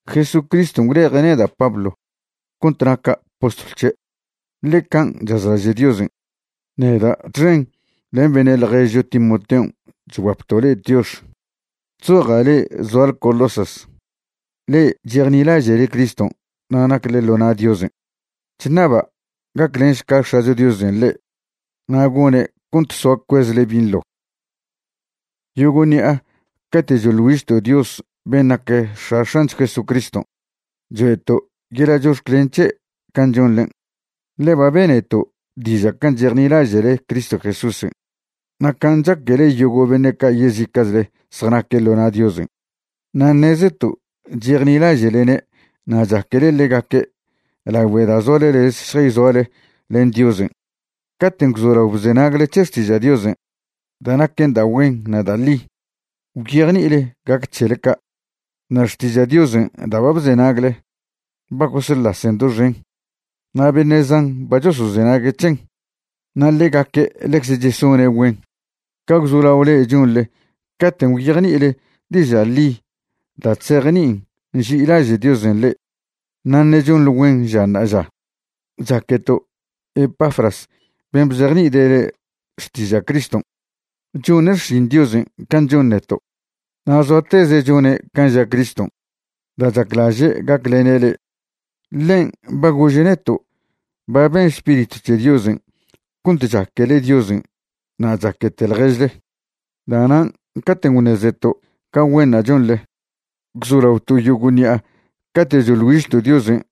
Jesucriston' gwleje' neda' Pablo cont naca' postlw c̱he', ḻe can' chazlaže' Diosen'. Neda' txen len beṉe' ḻježcho Timoteon' chguapto' le'e tiox. Chzoja' le'e zoale Colosas, le'e chejnilaže'le Criston' na' nacle ḻo na' Diosen'. Chṉaba' gaclenšca X̱acho Diosen' le'e na' gone' cont soa cuezle binḻo. Yogo' ṉi'a cate' choḻ güižto' Dios ben' nac X̱a X̱ancho Jesucriston' choe'to' yeḻa' chox̱clen c̱he' can' chonḻen'. Ḻe ba beneto' diža' can' chejnilaže'le Cristo Jesúsen' na' can' chaquele yogo' beṉe' ca' yezica'chle zjanaque' ḻo na' Diosen'. Na' ṉezeto' chejnilaže'lene' na' chaquele ḻegaque' lagüe da' zoale lez šjayzoale len Diosen'. Caten' gwzolao bzenagle c̱he xtiža' Diosen' da' naquen da' güen na' da' ḻi, gwyejni'ile gac c̱hele ca'. Na' xtiža' Diosen' da' ba bzenagle ba gosḻasen doxen, na' beṉe' zan ba chosozenague' c̱hen. Na' ḻegaque' ḻecze chesone' güen ca gwzolao le'e chonḻe caten' gwyejni'ile diža' ḻi da' chzejni'in nži'ilaže' Diosen' le'e, na' ṉe' chonḻe güen ža ṉa'aža. Chaqueto' Epafras ben' bzejni'ide' le'e xtiža' Criston'. Chone' xšin Diosen' can' chon neto', na' zoateze' chone' can' ža Criston' da' chaclaže' gaclene' le'e. Ḻen' ba gože' neto' ba ben Spiritw c̱he Diosen' cont chaquele Diosen' na' chaquete ḻježle. Da'nan' caten' gwṉezeto' ca güenṉa' chonḻe, gwzolaoto' yogo' ṉi'a cate' choḻ güižto' Diosen'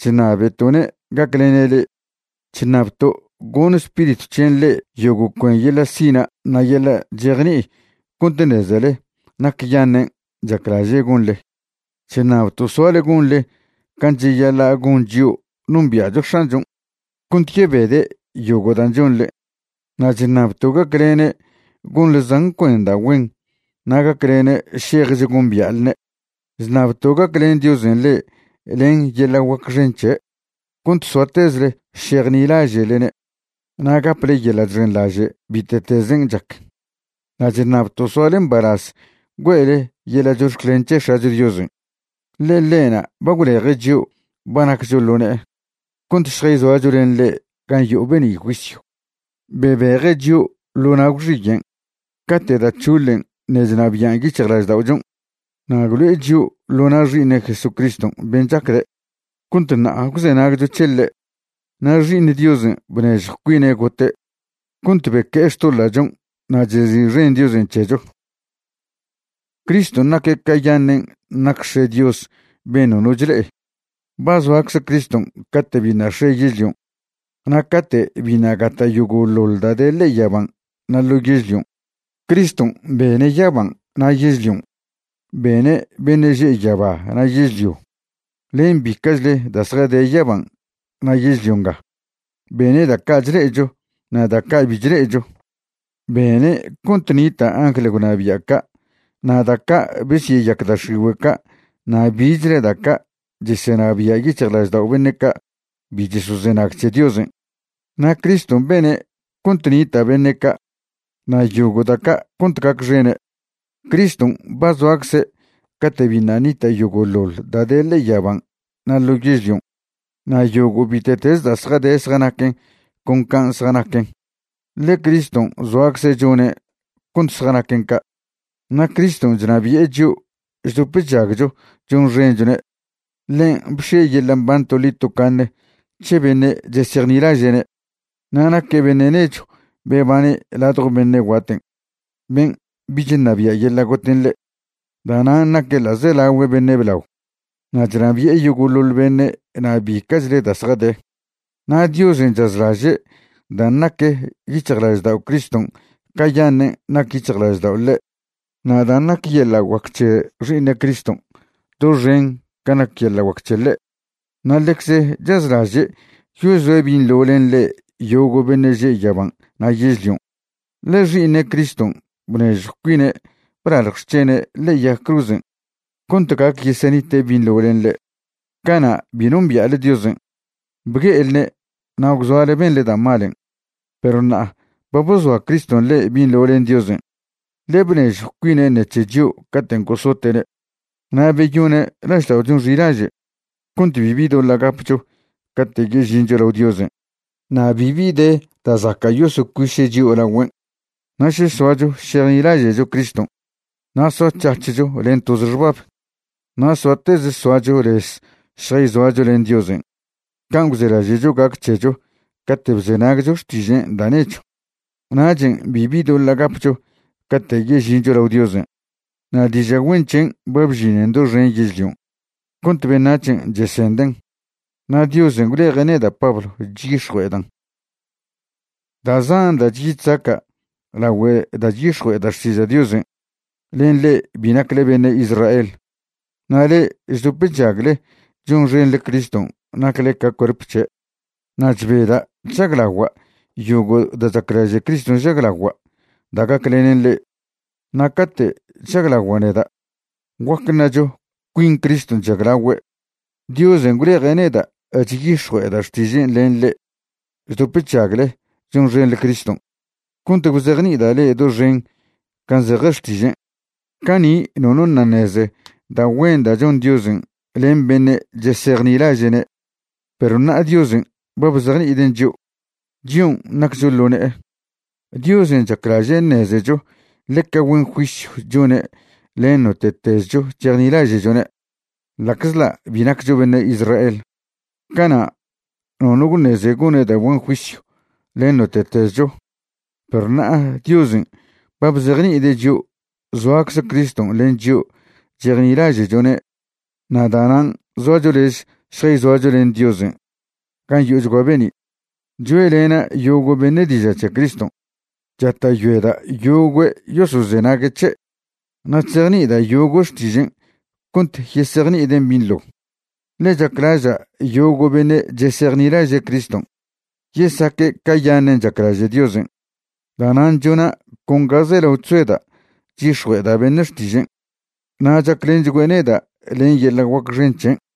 chṉabeto'ne' gaclene' le'e. Chṉabto' goṉ Spiritw c̱hen' le'e yogo' cuen yeḻa' sina' na' yeḻa' chejni'i cont ṉezele nacyaṉen' chaclaže' gonḻe. Chṉabto' soale gonḻe can' cheyaḻa' gon chio' nombia'cho X̱anchon', cont yebede' yogo' dan' chonḻe. Na' chṉabto' gaclene' gonḻe zan cuen da' güen na' gaclene' šejch gombia'lne'. Chṉabto' gaclen Diosen' le'e len yeḻa' guac xen c̱he' cont soatezle šejnilaže'lene' na' gaple yeḻa' chxenḻaže' bite'tezen' chac. Na' chṉabto' soale mbalaz güe'le yeḻa' chox̱clen c̱he X̱acho Diosen', ḻe ḻe'na' ba gwleje' chio' ba naccho ḻo ne'e cont šjayzoacho len ḻe' gan' yo'o be'ni' juisyw. Bebeje' chio' ḻo na' gwxiyen' cate' da' c̱hoḻen' ṉe' chnabian' yic̱hjlažda'ochon', na' gwlo'e chio' ḻo na' Xi'iṉe' Jesucriston' ben' chacde', cont ṉa'a gwzenagcho c̱he ḻe'. Na' Xi'iṉ Diosen' bnežjw cuine' gote' cont beque'e xtoḻa'chon' na' chezi'xen Diosen' c̱hecho. Criston' naque' cayaṉen' nac X̱e' Dios ben' nono chle'e. Ba zoacze Criston' cate' biṉa' x̱e yežlion' na' cate' biṉa' gata' yogo'ḻoḻ da' de ḻe'e yaban' na' ḻo yežlion'. Criston' bene' yaban' na' yežlion', bene' beṉe' že' yaba na' yežlio, len bica'chle da' zjade yaban' na' yežlio nga. Bene' da' ca' chle'echo na' da' ca' bi chle'echo. Bene' cont nita' angl gwnabia' ca' na' da' ca' besyeyac da' x̱igüe' ca' na' bichle da' ca' chesenabia' yic̱hjlaždao' beṉe' ca' bi chosozenag c̱he Diosen'. Na' Criston' bene' cont nita' beṉe' ca' na' yogo' da' ca' cont gacxene'. Criston' ba zoacze' cate' biṉa' ṉita' yogo'ḻoḻ da' de ḻe'e yaban' na' ḻo yežlion'. Na' yogo' bite'teze da' zjade zjanaquen con can' zjanaquen, ḻe Criston' zoacze' chone' cont zjanaquen ca'. Na' Criston' chnabi'e chio' chdop chžagcho chonxenchone'. Ḻen' bx̱ie' yeḻa' mban toḻi tocaṉe c̱he beṉe' chesejnilaže'ne', na' naque' beṉe' nechw bebane' ladjo beṉe' guaten' ben' bich ṉabia' yeḻa' goten' ḻe'. Da'nan' naque' ḻa'zelaogüe beṉe' blao na' chnabi'e yogo'ḻoḻ beṉe' na' bica'chle da' zjade. Na' Diosen' chazlaže' dan' nac yic̱hjlaždao' Criston' cayaṉen' nac yic̱hjlaždao' ḻe' na' dan' nac yeḻa' guac c̱he Xi'iṉe' Criston' doxen can' nac yeḻa' guac c̱he ḻe'. Na' ḻecze chazlaže' yozoe' binḻo len ḻe' yogo' beṉe' že' yaban' na' yežlion', ḻe Xi'iṉe' Criston' bnežjw cuine' blalj xc̱hene' ḻe'e yag cruzen' cont gac yesenite' binḻo len ḻe'. Cana' bi nombia'le Diosen'. Bgue'elne' na' gwzoale benḻe da' malen'. Perw ṉa'a ba bozoa Criston' le'e binḻo len Diosen', ḻe bnežjw cuine' ṉec̱he chio' caten' gosote'ne'. Na' beyone' lažda'ochon' xilaže' cont bibi doḻa' gapcho cate' yežincho lao Diosen', na' bibi de da' zaca' yosocuiše' chio' lagüen'. Na' še soacho šejnilaže'cho Criston' na' soac̱hac̱hcho len toze xbab, na' soateze soacho lez šjayzoacho len Diosen' can' gwzelaže'cho gac c̱hecho cate' bzenagcho xtižen' da' nechw, nachen' bibi doḻa' gapcho cate' yežincho lao Diosen'. Na' diža' güen c̱hen' ba bžinen doxen yežlion' cont beṉac̱hen' chesenden', na' Diosen' gwleje' neda' Pablo chyix̱jue'edan'. Da' zan da' chyi chzaca' lagüe da' chyix̱jue'eda' xtiža' Diosen' len le'e bi nacle beṉe' Israel. Na' le'e chdop chžagle chonxenḻe Criston' nacle ca cuerp c̱he'. Na' chbeda' chžaglagua' yogo' da' chaclaže' Criston' žaglagua' da' gaclenen le'e. Na' cate' chžaglagua' neda', guac ṉacho cuin Criston' chžaglagüe'. Diosen' gwleje' neda' chyix̱jue'eda' xtižen' len le'e chdop chžagle chonxenḻe Criston', cont gwzejni'ida' le'e doxen can' zeje xtižen'. Cani' nono ṉa' ṉeze da' güen da' chon Diosen' len beṉe' chesejnilaže'ne', perw ṉa'a Diosen' ba bzejni'iden' chio', chion' naccho ḻo ne'e. Diosen' chaclaže' ṉezecho ḻeca güen juisyw chone' len note'tezcho chejnilaže'chone', ḻa'czḻa' bi naccho beṉe' Israel. Cana' nono gwṉeze gone' da' güen juisyw len note'tezcho, perw ṉa'a Diosen' ba bzejni'ide' chio' zoacze Criston' len chio' chejnilaže'chone' na' da'nan' zoacho lez šjayzoacho len Diosen' gan' yo'ochgua be'ni'. Choe'lena' yogo' beṉe' diža' c̱he Criston', chata'yoeda' yogüe' yosozenague' c̱he', na' chzejni'ida' yogüe' xtižen' cont yesejni'iden' binḻo, ḻe chaclaža' yogo' beṉe' chesejnilaže' Criston' yesaque' cayaṉen' chaclaže' Diosen'. Da'nan' chona' con ga zelao chzoeda' chyix̱jue'eda' beṉe' xtižen', na' chaclenchgüe' neda' len yeḻa' guac xen c̱hen'.